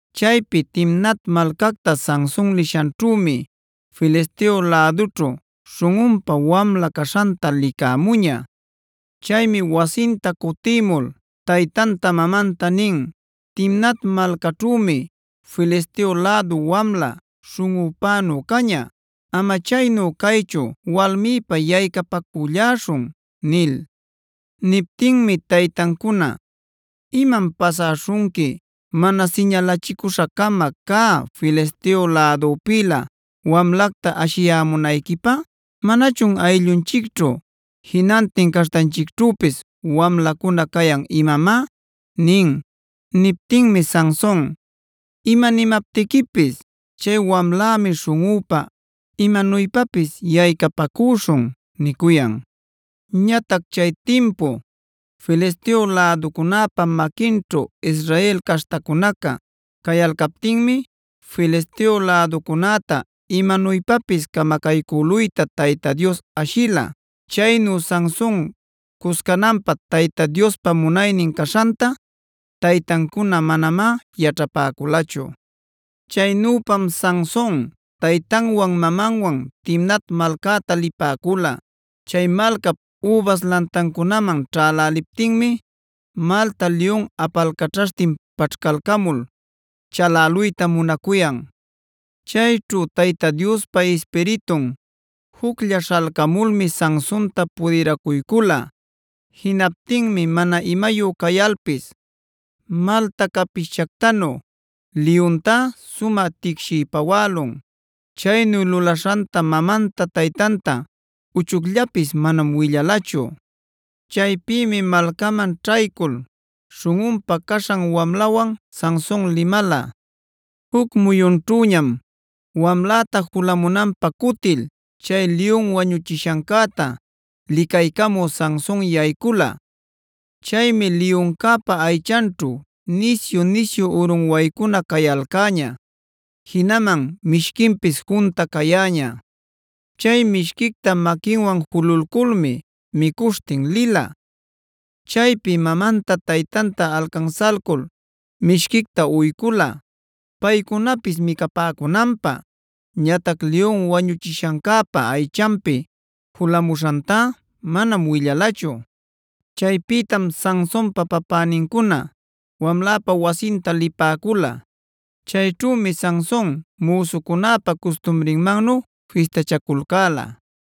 Chaypi Timnat malcacta Sanson liśhanćhümi Filisteo lädućhu śhunꞌunpä wamla caśhanta licämuña. Chaymi wasinta cutimul taytanta mamanta nin: “Timnat malcaćhümi Filisteo lädu wamla śhunꞌupänu caña. Ama chaynu caychu walmïpä yaycapacülläśhun” nil. Niptinmi taytancuna: “¿Imam pasäśhunqui mana siñalachicüśha-cama cä Filisteo lädupïlä wamlacta ashiyämunayquipä? ¿Manachun ayllunchicćhu, jinantin caśhtanchicćhüpis wamlacuna cayan imamá?” nin. Niptinmi Sanson: “Ima nimaptiquipis chay wamlämi śhunꞌüpä; imanuypapis yaycapacüśhun” nicuyan. Ñatac chay timpu Filisteo läducunäpa maquinćhu Israel caśhtacunaca cayalcaptinmi Filisteo läducunäta imanuypapis camacaycüluyta Tayta Dios ashila. Chaynu Sanson cuscananpä Tayta Diospa munaynin caśhanta taytancuna manamá yaćhapäculachu. Chaynüpam Sanson taytanwan mamamwan Timnat malcäta lipäcula. Chay malcap übas lantancunaman ćhäläliptinmi malta liyun apalcaćhaśhtin paćhcalcamul chaläluyta munacuyan. Chayćhu Tayta Diospa Ispiritun juclla śhalcamulmi Sansonta pudiracuycula. Jinaptinmi mana imayu cayalpis, malta capishchactanu liyuntá sumä ticshiy pawälun. Chaynu lulaśhanta mamanta taytanta uchucllapis manam willalachu. Chaypïmi malcaman ćhaycul śhunꞌunpä caśhan wamlawan Sanson limala. Juc muyunćhuñam wamläta julamunanpä cutil chay liyun wañuchishancäta licaycamü Sanson yaycula. Chaymi liyuncäpa aychanćhu nisyu-nisyu urunwaycuna cayalcäña, jinaman mishquinpis junta cayäña. Chay mishquicta maquinwan jululculmi micuśhtin lila. Chaypi mamanta taytanta alcansalcul mishquicta uycula paycunapis micapäcunanpä. Ñatac liyun wañuchishancäpa aychanpi julamuśhantá manam willalachu. Chaypïtam Sansonpa papänincuna wamläpa wasinta lipäcula. Chayćhümi Sanson müsucunäpa custumrinmannu fistachaculcäla.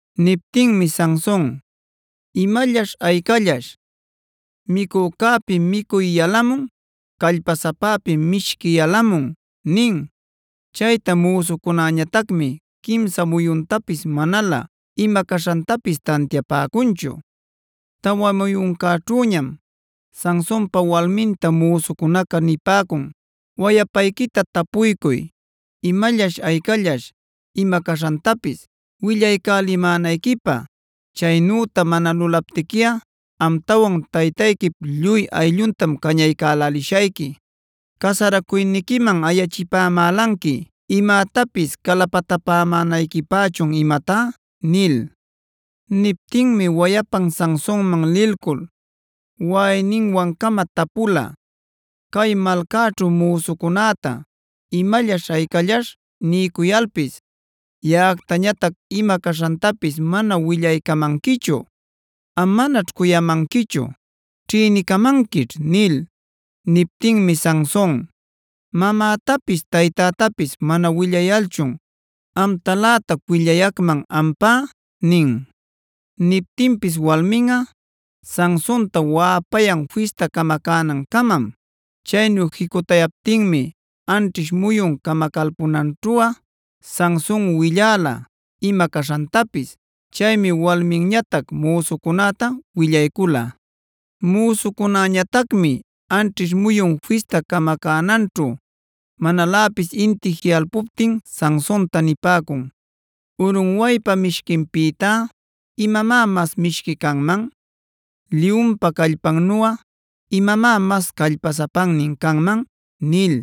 Niptinmi Sanson: “¿Imallaśh aycallaśh? Micucücäpi micuy yalamun; callpasapäpi mishqui yalamun” nin. Chayta müsucunäñatacmi quimsa muyuntapis manalä ima caśhantapis tantiapäcunchu. Tawa muyuncäćhüñam Sansonpa walminta müsucunaca nipäcun: “Wayapayquita tapuycuy, ¿imallaśh aycallaśhca? ima caśhantapis willaycälimänayquipä. Chaynüta mana lulaptiquiꞌa amtawan taytayquip lluy aylluntam cañaycälälishayqui. Casaracuyniquiman ayachipamälanqui imätapis calapatapämänayquipächun imatá” nil. Niptinmi wayapan Sansonman lilcul waꞌayninwancama tapula: “Cay malcäćhu müsucunäta ¿imallaśh aycallaśhta? niycuyalpis yaꞌactañatac ima caśhantapis mana willaycamanquichu. Am manaćh cuyamanquichu; ćhïnicamanquićh” nil. Niptinmi Sanson: “Mamätapis taytätapis mana willayalchun ¡amtalätac willayacman ampá!” nin. Niptinpis walminꞌa Sansonta waꞌapayan fista camacänancamam. Chaynu jicutayaptinmi anćhish muyun camacalpunancäćhuꞌa Sanson willala ima caśhantapis. Chaymi walminñatac müsucünäta willaycula. Müsucunäñatacmi anćhish muyun fista camacänancäćhu manaläpis inti jiꞌalpuptin Sansonta nipäcun: “Urunwaypa mishquinpïtá imamá mas mishqui canman. Liyunpa callpannuꞌa imamá mas callpasapannin canman” nil.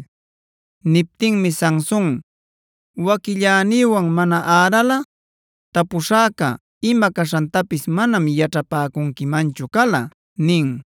Niptinmi Sanson: “Waquillänïwan mana äralꞌa tapuśhäca ima caśhantapis manam yaćhapäcunquimanchu cala” nin.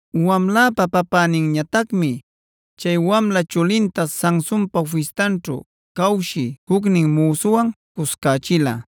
Wamläpa papäninñatacmi chay wamla chulinta Sansonpa fistanćhu cawshï jucnin müsuwan cuscächila.